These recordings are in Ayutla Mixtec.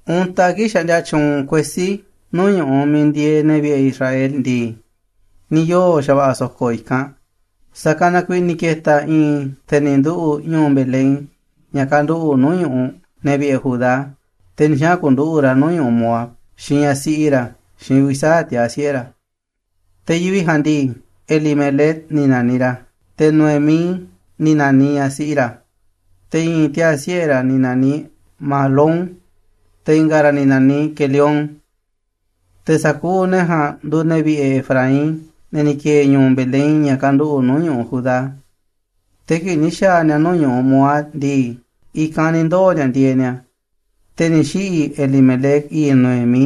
Untaꞌ kii̱ꞌ xaꞌndia tyuunꞌ kuesí nuu̱ꞌ ñu̱ꞌuꞌ miiꞌ ndieeꞌ ne̱ vi̱ꞌe̱ Israel ndii, ni̱ yoo̱ xa̱va̱ꞌa̱ so̱ko̱ i̱kanꞌ. Sa̱kanꞌ na kuiiꞌ ni̱ ke̱ta̱ i̱i̱n te̱ ni̱ nduꞌu̱ꞌ ñu̱u̱ Belén, ña̱ kanduꞌu̱ꞌ nuu̱ꞌ ñu̱ꞌuꞌ ne̱ vi̱ꞌe̱ Judá, te̱ ni̱ xaꞌa̱n ku̱nduꞌu̱ꞌ ra̱ nuu̱ꞌ ñu̱ꞌuꞌ Moab xiinꞌ ñaꞌ siꞌi ra̱, xiinꞌ uvi̱ sa̱aꞌ tiaa̱ siꞌe̱ ra̱. Te̱ yivi̱ꞌ ja̱a̱nꞌ ndii, Elimelec ni̱ na̱niꞌ ra̱, te̱ Noemí ni̱ na̱niꞌ ñaꞌ siꞌi ra̱, te̱ i̱i̱n tiaa̱ siꞌe̱ ra̱ ni̱ na̱niꞌ Mahlón, te̱ i̱nga̱ ra̱ ni̱ na̱niꞌ Quelión. Te̱ sa̱kuuꞌ ne̱ ja̱a̱nꞌ nduuꞌ ne̱ vi̱ꞌe̱ Efraín, ne̱ ni̱ ki̱e̱e̱ ñu̱u̱ Belén, ña̱ kanduꞌu̱ꞌ nuu̱ꞌ ñu̱ꞌuꞌ Judá. Te̱ kii̱ꞌ ni̱ xa̱a̱ ni̱a̱ nuu̱ꞌ ñu̱ꞌuꞌ Moab ndii, i̱kanꞌ ni̱ ndoo̱ ni̱a̱ ndieeꞌ ni̱a̱. Te̱ ni̱ xiꞌi̱ Elimelec, i̱i̱ꞌ Noemí,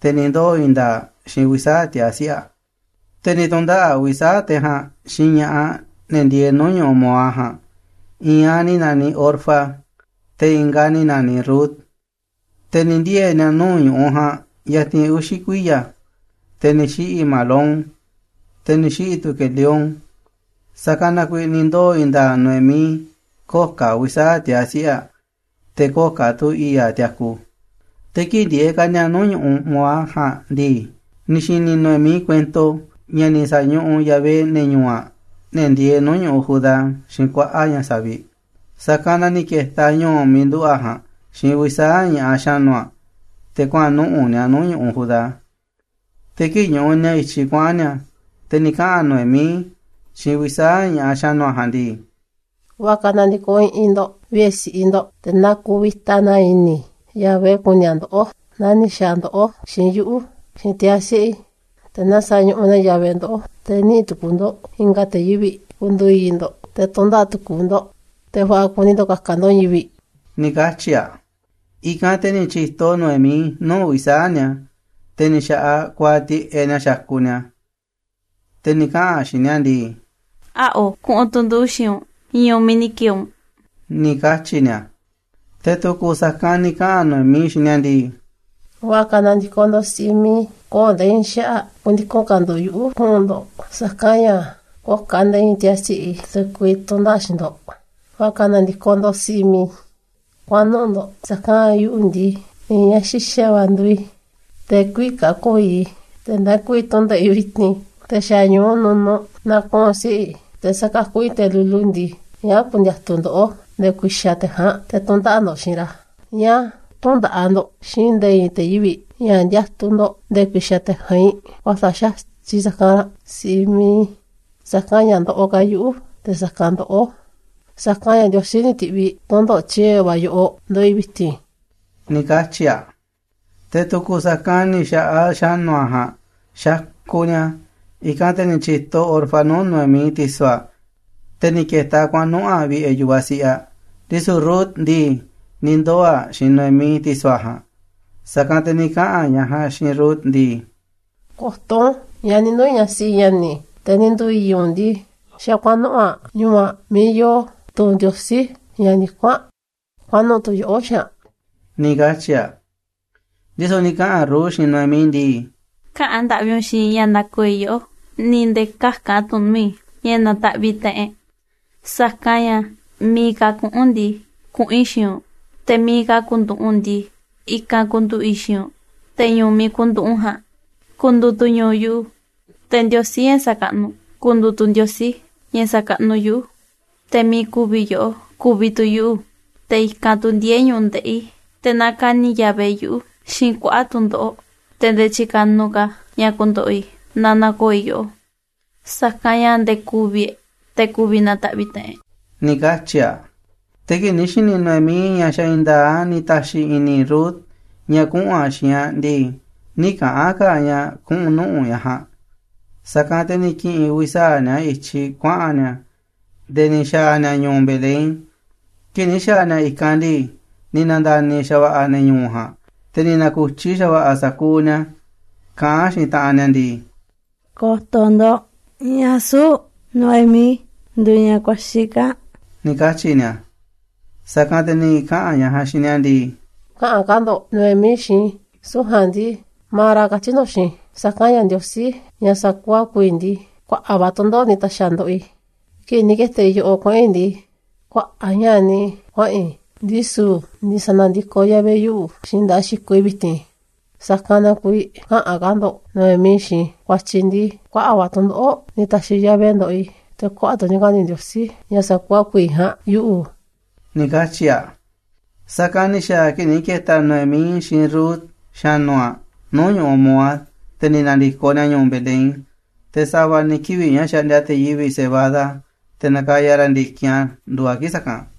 te̱ ni̱ ndoo̱ i̱i̱n nda̱a̱ꞌ aꞌ xiinꞌ uvi̱ sa̱aꞌ tiaa̱ siꞌe̱ aꞌ. Te̱ ni̱ tu̱ndaꞌa̱ꞌ uvi̱ sa̱aꞌ te̱ ja̱a̱nꞌ xiinꞌ ña̱ꞌaꞌ, ne̱ ndieeꞌ nuu̱ꞌ ñu̱ꞌuꞌ Moab ja̱a̱nꞌ. I̱i̱n aꞌ ni̱ na̱niꞌ Orfa, te̱ i̱nga̱ aꞌ ni̱ na̱niꞌ Rut. Te̱ ni̱ ndiee̱ ni̱a̱ nuu̱ꞌ ñu̱ꞌuꞌ ja̱a̱nꞌ yatinꞌ uxi̱ kuiya̱. Te̱ ni̱ xiꞌi̱ Mahlón, te̱ ni̱ xiꞌi̱ tu̱ Quelión, sa̱kanꞌ na kuiiꞌ ni̱ ndoo̱ i̱i̱n nda̱a̱ꞌ Noemí, köo̱ꞌ ka̱ uvi̱ sa̱aꞌ tiaa̱ siꞌe̱ aꞌ, te̱ köo̱ꞌ ka̱ tu̱ i̱i̱ꞌ aꞌ tiaku. Te̱ kii̱ꞌ ndieeꞌ ka̱ ni̱a̱ nuu̱ꞌ ñu̱ꞌuꞌ Moab ja̱a̱nꞌ ndii, ni̱ xi̱ni̱ Noemí kuento ña̱ ni̱ sa̱ñuꞌuꞌ Yahvé ne̱ ñu̱u̱ aꞌ, ne̱ ndieeꞌ nuu̱ꞌ ñu̱ꞌuꞌ Judá, xiinꞌ kuaꞌa̱ꞌ ña̱ savi̱ꞌ. Sa̱kanꞌ na ni̱ ke̱ta̱ aꞌ ñu̱u̱ miiꞌ nduꞌu̱ꞌ aꞌ ja̱a̱nꞌ xiinꞌ uvi̱ sa̱aꞌ ña̱ꞌaꞌ xa̱nu̱ aꞌ, te̱ kuaꞌa̱n nuꞌu̱ꞌ ni̱a̱ nuu̱ꞌ ñu̱ꞌuꞌ Judá. Te̱ kii̱ꞌ ñuꞌuꞌ ni̱a̱ i̱tyiꞌ kuaꞌa̱n ni̱a̱, te̱ ni̱ kaꞌa̱n Noemí xiinꞌ uvi̱ sa̱aꞌ ña̱ꞌaꞌ xa̱nu̱ aꞌ ja̱a̱nꞌ ndii: ―Va̱ꞌa̱ ka̱ na̱ndi̱koꞌ i̱ꞌi̱n ndo̱ꞌ vi̱ꞌe̱ si̱ꞌiꞌ ndo̱ꞌ, te̱ na ku̱vi̱ta na i̱ni̱ Yahvé ku̱ni̱ a̱ ndoꞌó naa ni̱ xa̱a̱ ndoꞌó xiinꞌ yuꞌu̱, xiinꞌ tiaa̱ siꞌe̱ i̱. Te̱ na sa̱ñuꞌuꞌ na Yahvé ndoꞌó, te̱ niꞌi̱ꞌ tukuuꞌ ndo̱ꞌ i̱nga̱ te̱ yivi̱ꞌ ku̱ndu̱u̱ i̱i̱ꞌ ndo̱ꞌ, te̱ tu̱ndaꞌa̱ꞌ tukuuꞌ ndo̱ꞌ, te̱ va̱ꞌa̱ kuni ndo̱ꞌ ka̱ka̱ ndo̱ꞌ i̱i̱n yivi̱ꞌ ―ni̱ katyi̱ aꞌ. I̱kanꞌ te̱ ni̱ tyi̱to Noemí nuu̱ꞌ uvi̱ sa̱aꞌ ni̱a̱, te̱ ni̱ xa̱ꞌaꞌ kuaaꞌ tiꞌeꞌ ni̱a̱ xakuꞌ ni̱a̱, te̱ ni̱ kaꞌa̱n ni̱a̱ xiinꞌ aꞌ ndii: ―Äa̱ꞌo, kuꞌu̱n tu̱ nduꞌu̱ xiinꞌ u̱nꞌ ñu̱u̱ miiꞌ ni̱ ki̱e̱e̱ u̱nꞌ ―ni̱ katyi̱ ni̱a̱. Te̱ tu̱ku̱ sa̱kanꞌ ni̱ kaꞌa̱n Noemí xiinꞌ ni̱a̱ ndii: ―Va̱ꞌa̱ ka̱ na̱ndi̱koꞌ ndo̱ꞌ, si̱ꞌiꞌ mi̱iꞌ i̱. Köo̱ꞌ nde̱e̱ i̱i̱n xaꞌa̱ꞌ ku̱ndiku̱n ka̱ ndo̱ꞌ yuꞌu̱ kuꞌu̱n ndo̱ꞌ, sa̱kanꞌ ña̱ köo̱ꞌ ka̱ nde̱e̱ i̱i̱n tiaa̱ siꞌe̱ i̱ te̱ ku̱vi̱ tu̱ndaꞌa̱ꞌ xiinꞌ ndo̱ꞌ. Va̱ꞌa̱ ka̱ na̱ndi̱koꞌ ndo̱ꞌ, si̱ꞌiꞌ mi̱iꞌ i̱, kuaꞌan nuꞌu̱ꞌ ndo̱ꞌ, sa̱kanꞌ ña̱ yuꞌu̱ ndii, i̱i̱n ñaꞌ xi̱xa̱ va̱ nduuꞌ i̱, te̱ kü̱vi̱ ka̱ ko̱o̱ i̱i̱ꞌ i̱. Tee̱ꞌ ndee ku̱vi̱ tu̱ndaꞌa̱ꞌ i̱ vi̱ti̱n, te̱ xa̱ ñu̱u nunuꞌ na̱kuꞌu̱n siꞌe̱ i̱, te̱ sa̱kakuꞌ i̱ i̱i̱n te̱ lulu ndii, ¿ñáá ku̱ndi̱a̱tu̱ ndoꞌó nde̱e̱ ku̱i̱xa̱ te̱ ja̱a̱nꞌ te̱ tu̱ndaꞌa̱ꞌ ndo̱ꞌ xiinꞌ ra̱? ¿Ñáá tü̱ndaꞌa̱ꞌ ndo̱ꞌ xiinꞌ nde̱e̱ i̱i̱n te̱ yivi̱ꞌ ña̱ ndiatuꞌ ndo̱ꞌ nde̱e̱ ku̱i̱xa̱ te̱ ja̱a̱nꞌ vi̱ꞌ? Kuäsa̱ꞌ xa̱tyiꞌ sa̱kanꞌ ranꞌ, si̱ꞌiꞌ mi̱iꞌ i̱. Sa̱kanꞌ ña̱ ndoꞌoꞌ ka̱ yuꞌu̱ te̱ sa̱kanꞌ ndoꞌó, sa̱kanꞌ ña̱ Ndiosí ni̱ ti̱ꞌviꞌ tu̱ndoꞌo̱ꞌ tyiee̱ va̱ yoꞌoꞌ ndoꞌoꞌ i̱ vi̱ti̱n ―ni̱ katyi̱ aꞌ. Te̱ tu̱ku̱ sa̱kanꞌ ni̱ xa̱ꞌaꞌ xa̱nu̱ aꞌ ja̱a̱nꞌ xakuꞌ ni̱a̱. iIkanꞌ te̱ ni̱ tyi̱to Orfa nuu̱ꞌ Noemí, ti̱so̱ aꞌ, te̱ ni̱ ke̱ta̱ aꞌ kuaꞌa̱n nuꞌu̱ꞌ aꞌ vi̱ꞌe̱ yu̱vaꞌ siꞌiꞌ aꞌ. Ndisu̱ Rut ndii, ni̱ ndoo̱ aꞌ xiinꞌ Noemí, ti̱so̱ aꞌ ja̱a̱nꞌ. Sa̱kanꞌ te̱ ni̱ kaꞌa̱n ñaꞌ ja̱a̱nꞌ xiinꞌ Rut ndii: ―Ko̱to̱ u̱nꞌ, ñaꞌ ni̱ nduu̱ ñaꞌ siꞌi ña̱ni̱ te̱ ni̱ nduu̱ i̱i̱ꞌ u̱nꞌ ndii, xa̱ kuaꞌa̱n nuꞌu̱ꞌ aꞌ ñu̱u̱ aꞌ miiꞌ yoo tu̱ ndiosí, ña̱ ndikún aꞌ. Kuaꞌan nuꞌu̱ꞌ tu̱ yoꞌó xiinꞌ aꞌ ―ni̱ katyi̱ aꞌ. Ndisu̱ ni̱ kaꞌa̱n Rut xiinꞌ Noemí ndii: ―Käꞌa̱n ndaꞌvi u̱nꞌ xiinꞌ i̱ ña̱ na̱ko̱o̱ i̱ yoꞌó, ni̱ nde̱e̱ käka̱n tu̱ u̱nꞌ nuu̱ꞌ i̱̱ ña̱ na̱ta̱ꞌviꞌ taꞌanꞌ e̱ꞌ, sa̱kanꞌ ña̱ miiꞌ ka̱ kuꞌu̱n u̱nꞌ ndii, kuꞌu̱n i̱ xiinꞌ u̱nꞌ, te̱ miiꞌ ka̱ ku̱nduꞌu̱ꞌ u̱nꞌ ndii, i̱kanꞌ ku̱nduꞌu̱ꞌ i̱ xiinꞌ u̱nꞌ. Te̱ ñu̱u̱ u̱nꞌ miiꞌ ku̱nduꞌu̱ꞌ u̱nꞌ ja̱a̱nꞌ ku̱ndu̱u̱ tu̱ ñu̱u̱ yuꞌu̱, te̱ Ndiosí, ña̱ xakaꞌnuꞌ u̱nꞌ ku̱ndu̱u̱ tu̱ Ndiosí ña̱ sa̱kaꞌnuꞌ yuꞌu̱. Te̱ miiꞌ ku̱vi̱ yoꞌó, ku̱vi̱ tu̱ yuꞌu̱, te̱ i̱kanꞌ tu̱ ndiee̱ ñu̱ꞌuꞌ ndeꞌi̱ i̱. Te̱ na ka̱ni̱ Yahvé yuꞌu̱ xiinꞌ kuaꞌa̱ꞌ tu̱ndoꞌo̱ꞌ, te̱ nde̱e̱ tyi̱ka̱nuꞌ ka̱ a̱ ña̱ ku̱ndo̱ꞌo̱ i̱ naa na̱ko̱o̱ i̱ yoꞌó, sa̱kanꞌ ña̱ nde̱e̱ ku̱vi̱ e̱ꞌ, te̱ ku̱vi̱ na̱ta̱ꞌviꞌ taꞌanꞌ e̱ꞌ ―ni̱ katyi̱ aꞌ. Te̱ kii̱ꞌ ni̱ xi̱ni̱ Noemí ña̱ xa̱ i̱i̱n nda̱a̱ꞌ a̱ ni̱ ta̱xi̱ i̱ni̱ Rut ña̱ kuꞌu̱n aꞌ xiinꞌ aꞌ ndii, nï̱ kaꞌa̱n ka̱ aꞌ ña̱ kuꞌu̱n nuꞌu̱ꞌ ñaꞌ ja̱a̱nꞌ. Sa̱kanꞌ te̱ ni̱ ki̱ꞌi̱n uvi̱ sa̱aꞌ ni̱a̱ i̱tyiꞌ kuaꞌa̱n ni̱a̱ nde̱e̱ ni̱ xa̱a̱ ni̱a̱ ñu̱u̱ Belén. Kii̱ꞌ ni̱ xa̱a̱ ni̱a̱ i̱kanꞌ ndii, ni̱ na̱nda̱ni̱ xa̱va̱ꞌa̱ ne̱ ñu̱u̱ ja̱a̱nꞌ, te̱ ni̱ na̱ku̱tyi xa̱va̱ꞌa̱ sa̱kuuꞌ ni̱a̱ kaꞌán xiinꞌ taꞌanꞌ ni̱a̱ ndii: ―Ko̱to̱ ndo̱ꞌ, ¿ñáá süu̱ꞌ Noemí nduuꞌ ñaꞌ kuaxi̱ kaa̱ꞌ? ―ni̱ katyi̱ ni̱a̱. Sa̱kanꞌ te̱ ni̱ kaꞌa̱n ñaꞌ ja̱a̱nꞌ xiinꞌ ni̱a̱ ndii: ―Käꞌa̱n ka̱ ndo̱ꞌ Noemí xiinꞌ i̱, süu̱ꞌ ja̱a̱nꞌ ndii Mara katyi̱ ndo̱ꞌ xiinꞌ i̱, sa̱kanꞌ ña̱ Ndiosí, ña̱ sakuuꞌ a̱ ku̱vi̱ ndii, kuaꞌa̱ꞌ va̱ tu̱ndoꞌo̱ꞌ ni̱ ta̱xi̱ a̱ ndoꞌoꞌ i̱. Kii̱ꞌ ni̱ ke̱ta̱ i̱ yoꞌoꞌ kuaꞌa̱n i̱ ndii, kuaꞌa̱ꞌ ña̱ꞌa̱ niꞌiꞌ i̱ kuaꞌa̱n i̱, ndisu̱ ni̱ sa̱na̱ndi̱koꞌ Yahvé yuꞌu̱ xiinꞌ nda̱ꞌaꞌ xikoꞌ i̱ vi̱ti̱n. Sa̱kanꞌ na kuiiꞌ käꞌa̱n ka̱ ndo̱ꞌ Noemí xiinꞌ i̱, ku̱a̱tyi̱ ndii kuaꞌa̱ꞌ va̱ tu̱ndoꞌo̱ꞌ ni̱ ta̱xi̱ Yahvé ndoꞌoꞌ i̱, te̱ kuaꞌa̱ꞌ tu̱ ni̱ ka̱ni̱ Ndiosí, ña̱ sa̱kuuꞌ a̱ ku̱vi̱ ja̱a̱nꞌ, yuꞌu̱ ―ni̱ katyi̱ aꞌ. Sa̱kanꞌ ni̱ xa̱a̱ a̱ kii̱ꞌ ni̱ ke̱ta̱ Noemí xiinꞌ Rut, xa̱nu̱ aꞌ, nuu̱ꞌ ñu̱ꞌuꞌ Moab, te̱ ni̱ na̱ndi̱koꞌ ni̱a̱ ñu̱u̱ Belén. Te̱ sa̱va̱ ni̱ kivi̱ꞌ ña̱ xaꞌndia te̱ yivi̱ꞌ cebada, te̱ nakaya ra̱ ndi̱kinꞌ a̱ nduuꞌ a̱ kii̱ꞌ sa̱kanꞌ.